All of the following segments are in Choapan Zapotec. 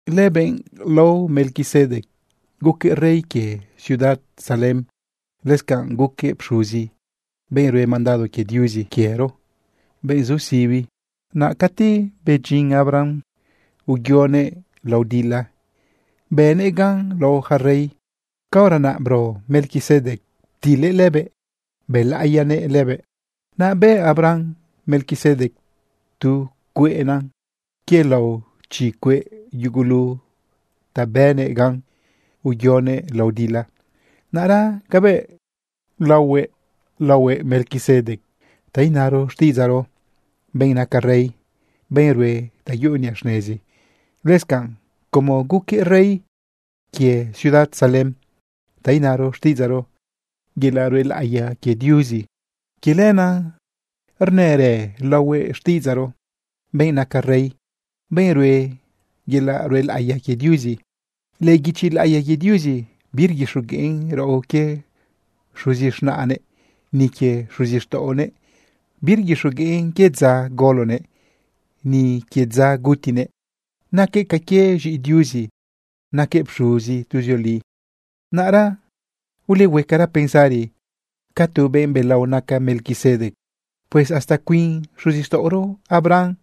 Lëbenꞌ lao Melquisedec guquëꞌ rey quie ciudad Salem. Lëscanꞌ guquëꞌ pxuzi, benꞌ rue mandado quie Diuzi quiero, benꞌ zu sibi. Naꞌ cati bedyin Abraham, uyoguëꞌ lao dila, bënëꞌ gan lao yaca rey. Caora naꞌ bro Melquisedec ptilëꞌ lëbëꞌ bëlaꞌiyanëꞌ lëbëꞌ. Naꞌ bëꞌ Abraham Melquisedec tu cueꞌna quie lao chi cueꞌ yugulu ta bënëꞌ gan uyoguëꞌ lao dila. Naꞌra cabëꞌ laohuëꞌ, laohuëꞌ Melquisedec, ta inaro xtiꞌidzaꞌro: “Benꞌ naca rey, benꞌ rue ta yuꞌu niꞌa xnezi.” Lëscanꞌ como guquëꞌ rey quie ciudad Salem, ta inaro xtiꞌidzaꞌro: “Yelaꞌ ruelaꞌiya quie Diuzi”, quie lenaꞌ rnërë laohuëꞌ xtiꞌidzaꞌro: “Benꞌ naca rey, benꞌ rue yelaꞌ ruelaꞌiya quie Diuzi.” Lëꞌë guichi laꞌiya quie Diuzi birguixogueꞌn raꞌo quie xuzi z̃naꞌnëꞌ, ni quie xuzixtaꞌonëꞌ. Birguixogueꞌn quie dza golonëꞌ, ni quie dza gutinëꞌ. Naquëꞌ ca que z̃iꞌi Diuzi, naquëꞌ pxuzi tuzioli. Naꞌra ulehuecara pensari ca tu benꞌ belao naca Melquisedec. Pues hasta cuin xuzixtaꞌoro Abraham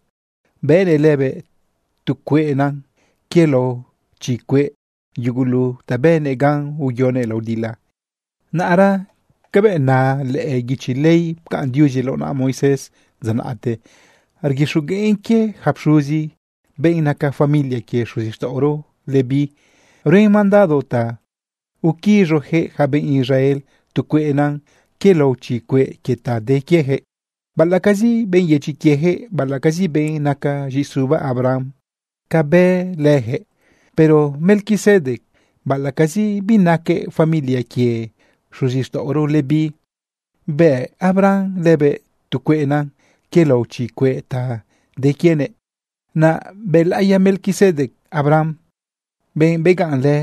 bëꞌnëꞌ lëbëꞌ tu cueꞌna quie lao chi cueꞌ yugulu ta bënëꞌ gan uyoguëꞌ lao dila. Naꞌra cabëꞌ na lëꞌë guichi ley pcaꞌn Diuzi lao naꞌa Moisés dza naꞌte, rguixogueꞌn quie yaca pxuzi, benꞌ naca familia quie xuzixtaꞌoro Leví. Ruen mandado ta uquiz̃ujëꞌ yaca benꞌ Israel tu cueꞌna quie lao chi cueꞌ quie ta de quiejëꞌ, baꞌalaꞌcazi benꞌ yedyi quiejëꞌ, baꞌalaꞌcazi benꞌ naca z̃iꞌisuba Abraham cabëꞌ lëjëꞌ. Pero Melquisedec, baꞌalaꞌcazi binaquëꞌ familia quie xuzixtaꞌoro Leví, bëꞌ Abraham lëbëꞌ tu cueꞌna quie lao chi cueꞌ ta de quienëꞌ. Naꞌ bëlaꞌiya Melquisedec Abraham, benꞌ begaꞌnlë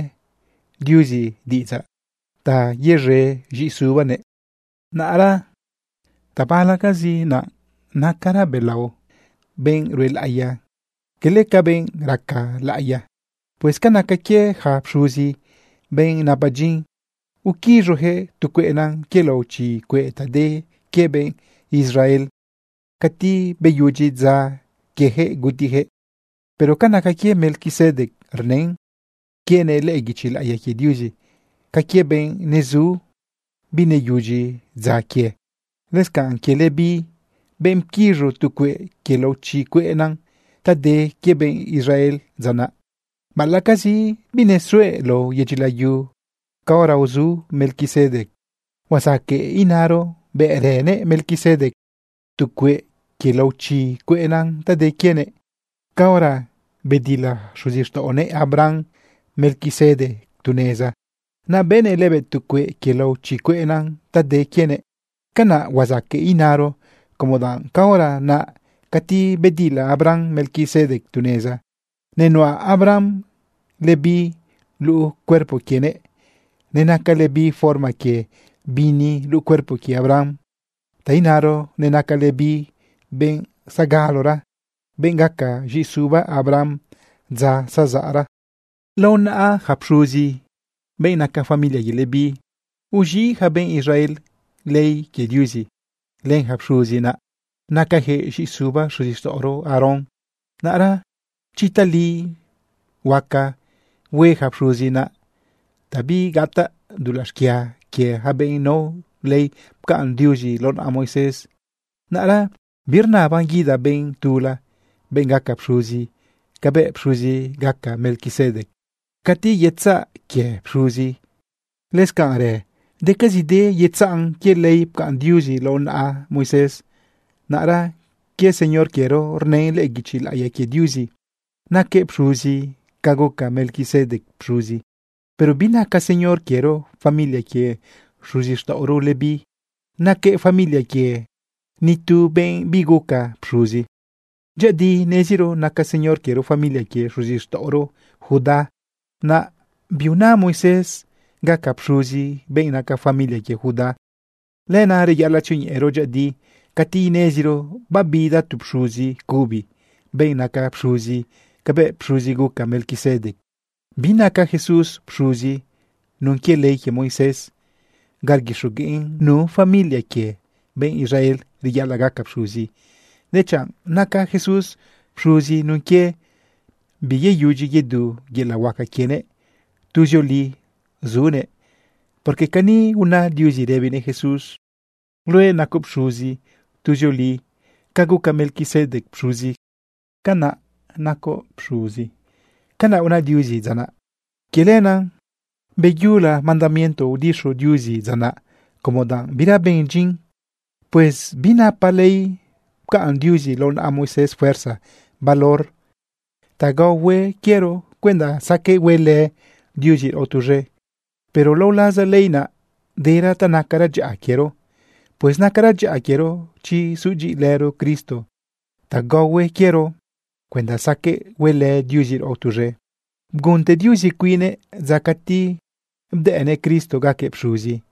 Diuzi diꞌidzaꞌ ta yez̃e z̃iꞌisubanëꞌ. Naꞌra tabalacazi naꞌ nacara belao benꞌ ruelaꞌiya quele ca benꞌ raca laꞌiya. Pues ca naca quie yaca pxuzi, benꞌ napa dyin uquiz̃ujëꞌ tu cueꞌna quie lao chi cueꞌ ta de quie benꞌ Israel, cati beyudyi dza quiejëꞌ gutijëꞌ. Pero ca naca quie Melquisedec, rnën quienëꞌ lëꞌë guichi laꞌiya quie Diuzi ca quie benꞌ nezu bineyudyi dza quie. Lëscanꞌ quie Leví, benꞌ pquiz̃u tu cueꞌ quie lao chi cueꞌna ta de quie benꞌ Israel dza naꞌ, baꞌalaꞌcazi binesuëꞌ lao yedyi layu caora uzu Melquisedec, huazaqueꞌ inaro bëꞌrënëꞌ Melquisedec tu cueꞌ quie lao chi cueꞌna ta de quienëꞌ caora bedila xuzixtaꞌonëꞌ Abraham Melquisedec tu neza, naꞌ bëꞌnëꞌ lëbëꞌ tu cueꞌ quie lao chi cueꞌna ta de quienëꞌ. Canaꞌ huazaqueꞌ inaro como danꞌ caora naꞌ cati bedila Abraham Melquisedec tu neza, nenuꞌa Abraham Leví luꞌu cuerpo quienëꞌ, nenaca Leví forma quie bini luꞌu cuerpo quie Abraham, ta inaro nenaca Leví benꞌ zagalora, benꞌ gaca z̃iꞌisuba Abraham dza zazaꞌra. Lao naꞌa yaca pxuzi, benꞌ naca familia quie Leví, uz̃iꞌ yaca benꞌ Israel ley quie Diuzi. Lëyaca pxuzi naꞌ nacajëꞌ z̃iꞌisuba xuzixtaꞌoro Aarón. Naꞌra chi tali huaca hue yaca pxuzi naꞌ ta bigataꞌ dulaꞌ xquia quie ja benꞌ nao ley pcaꞌn Diuzi lao naꞌa Moisés, naꞌra birnaban guida benꞌ tula, benꞌ gaca pxuzi cabëꞌ pxuzi gaca Melquisedec. Cati yetzaꞌ quie pxuzi, lëscanꞌrë decazide yetzaꞌn quie ley pcaꞌn Diuzi lao naꞌa Moisés. Naꞌra quie Señor quiero, rnën lëꞌë guichi laꞌiya quie Diuzi naquëꞌ pxuzi ca guca Melquisedec pxuzi. Pero binaca Señor quiero familia quie xuzixtaꞌoro Leví. Naquëꞌ familia quie ni tu benꞌ biguca pxuzi. Dyëꞌëdi neziro naca Señor quiero familia quie xuzixtaꞌoro Judá. Naꞌ biuna Moisés gaca pxuzi benꞌ naca familia quie Judá. Lenaꞌ reyaꞌalaꞌ tzioñeꞌero dyëꞌëdi cati ineziro babida tu pxuzi cubi, benꞌ naca pxuzi cabëꞌ pxuzi guca Melquisedec. Binaca Jesús pxuzi nun quie ley quie Moisés ga rguixogueꞌn nu familia quie benꞌ Israel reyaꞌalaꞌ gaca pxuzi, dechanꞌ naca Jesús pxuzi nun quie biyeyudyi yedu yelaꞌ huaca quienëꞌ, tuzioli sunëꞌ. Porque cani una Diuzi rëbinëꞌ Jesús: Luëꞌ nacoꞌ pxuzi tuzioli, ca guca Melquisedec pxuzi, canaꞌ nacoꞌ pxuzi. Canaꞌ una Diuzi dza naꞌ. Quie lenaꞌ beyula mandamiento udixu Diuzi dza naꞌ como danꞌ bira ben dyin. Pues binapa ley pcaꞌn Diuzi lao naꞌa Moisés fuerza valor ta gaohue quiero cuenda saqueꞌ huelë Diuzi raꞌo tuz̃e. Pero lao laza ley naꞌ, dera ta nacara dyaꞌa quiero. Pues nacara dyaꞌa quiero chi sudyiꞌilëro Cristo ta gaohue quiero cuenda saqueꞌ huelë Diuzi raꞌo tuz̃e. Bgunte Diuzi cuinnëꞌ dza cati bdëꞌnëꞌ Cristo gaquëꞌ pxuzi.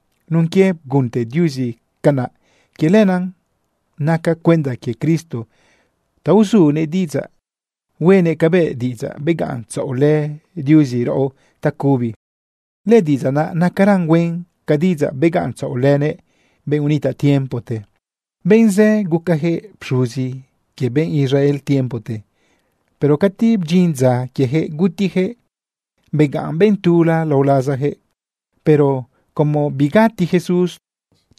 Nun quie bgunte Diuzi canaꞌ, quie lenaꞌ naca cuenda quie Cristo ta uzunëꞌ diꞌidzaꞌ huenëꞌ cabëꞌ diꞌidzaꞌ begaꞌntzaꞌolë Diuzi raꞌo tacubi. Lëdiꞌidzaꞌ naꞌ nacaran huen ca diꞌidzaꞌ begaꞌntzaꞌolënëꞌ benꞌ unitaꞌ tiempote. Benꞌ zë gucajëꞌ pxuzi quie benꞌ Israel tiempote, pero cati bdyin dza quiejëꞌ gutijëꞌ, begaꞌn benꞌ tula lao lazajëꞌ. Pero como bigati Jesús,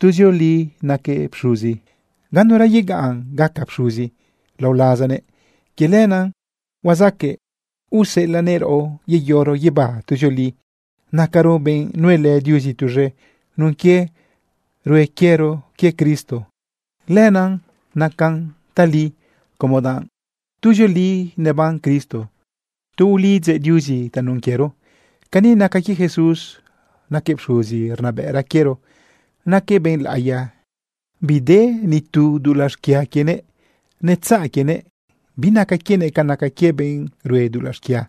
tuzioli naquëꞌ pxuzi, ganura yegaꞌn gaca pxuzi lao lazanëꞌ. Quie lenaꞌ huazaqueꞌ uselanëꞌ raꞌo yeyoro guibá tuzioli. Nacaro benꞌ nuelë Diuzi tuz̃e nun quie rue quiero quie Cristo. Lenaꞌ nacan tali, como danꞌ tuzioli neban Cristo tu ulidzëꞌ Diuzi tanun quiero. Cani naca quie Jesús: Naquëꞌ pxuzi rnabëꞌra quiero, naquëꞌ benꞌ laꞌiya, bide ni tu dulaꞌ xquia quienëꞌ. Netzaꞌ quienëꞌ, binaca quienëꞌ ca naca quie benꞌ rue dulaꞌ xquia.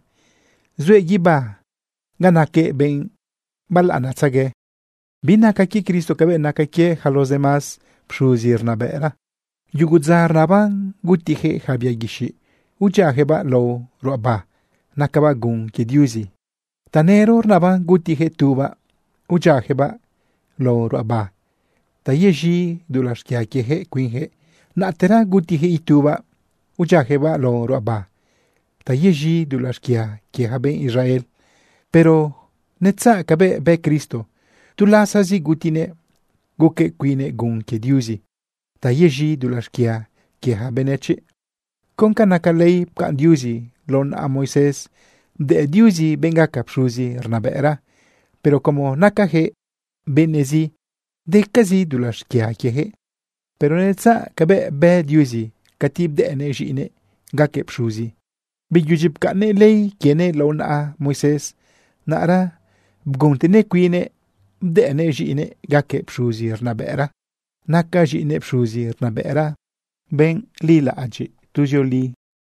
Zuëꞌ guibá ga naquëꞌ benꞌ balaꞌanatzegue. Binaca quie Cristo cabëꞌ naca quie yaca los demás pxuzi rnabëꞌra. Yugu dza rnaban gutijëꞌ yaca bia guixiꞌ udyiajëꞌbaꞌ lao ruꞌaba nacabaꞌ gun quie Diuzi. Tanëro rnaban gutijëꞌ tubaꞌ udyiajëꞌbaꞌ lao ruꞌaba ta yez̃i dulaꞌ xquia quiejëꞌ cuinjëꞌ. Naꞌtera gutijëꞌ itubaꞌ udyiajëꞌbaꞌ lao ruꞌaba ta yez̃i dulaꞌ xquia quie ja benꞌ Israel. Pero netzaꞌ cabëꞌ bë Cristo. Tu lasazi gutinëꞌ guquëꞌ cuinnëꞌ gun quie Diuzi ta yez̃i dulaꞌ xquia quie yaca benëchiꞌ. Con ca naca ley pcaꞌn Diuzi lao naꞌa Moisés, bdëꞌ Diuzi benꞌ gaca pxuzi rnabëꞌra. Pero como nacajëꞌ benëꞌzi, decazi dulaꞌ xquia quiejëꞌ. Pero netzaꞌ cabëꞌ bë Diuzi cati bdëꞌnëꞌ z̃iꞌinëꞌ gaquëꞌ pxuzi. Beyudyi pcaꞌnnëꞌ ley quienëꞌ lao naꞌa Moisés, naꞌra bguntenëꞌ cuinnëꞌ bdëꞌnëꞌ z̃iꞌinëꞌ gaquëꞌ pxuzi rnabëꞌra. Naca z̃iꞌinëꞌ pxuzi rnabëꞌra, benꞌ lilaꞌadyiꞌ tuzioli.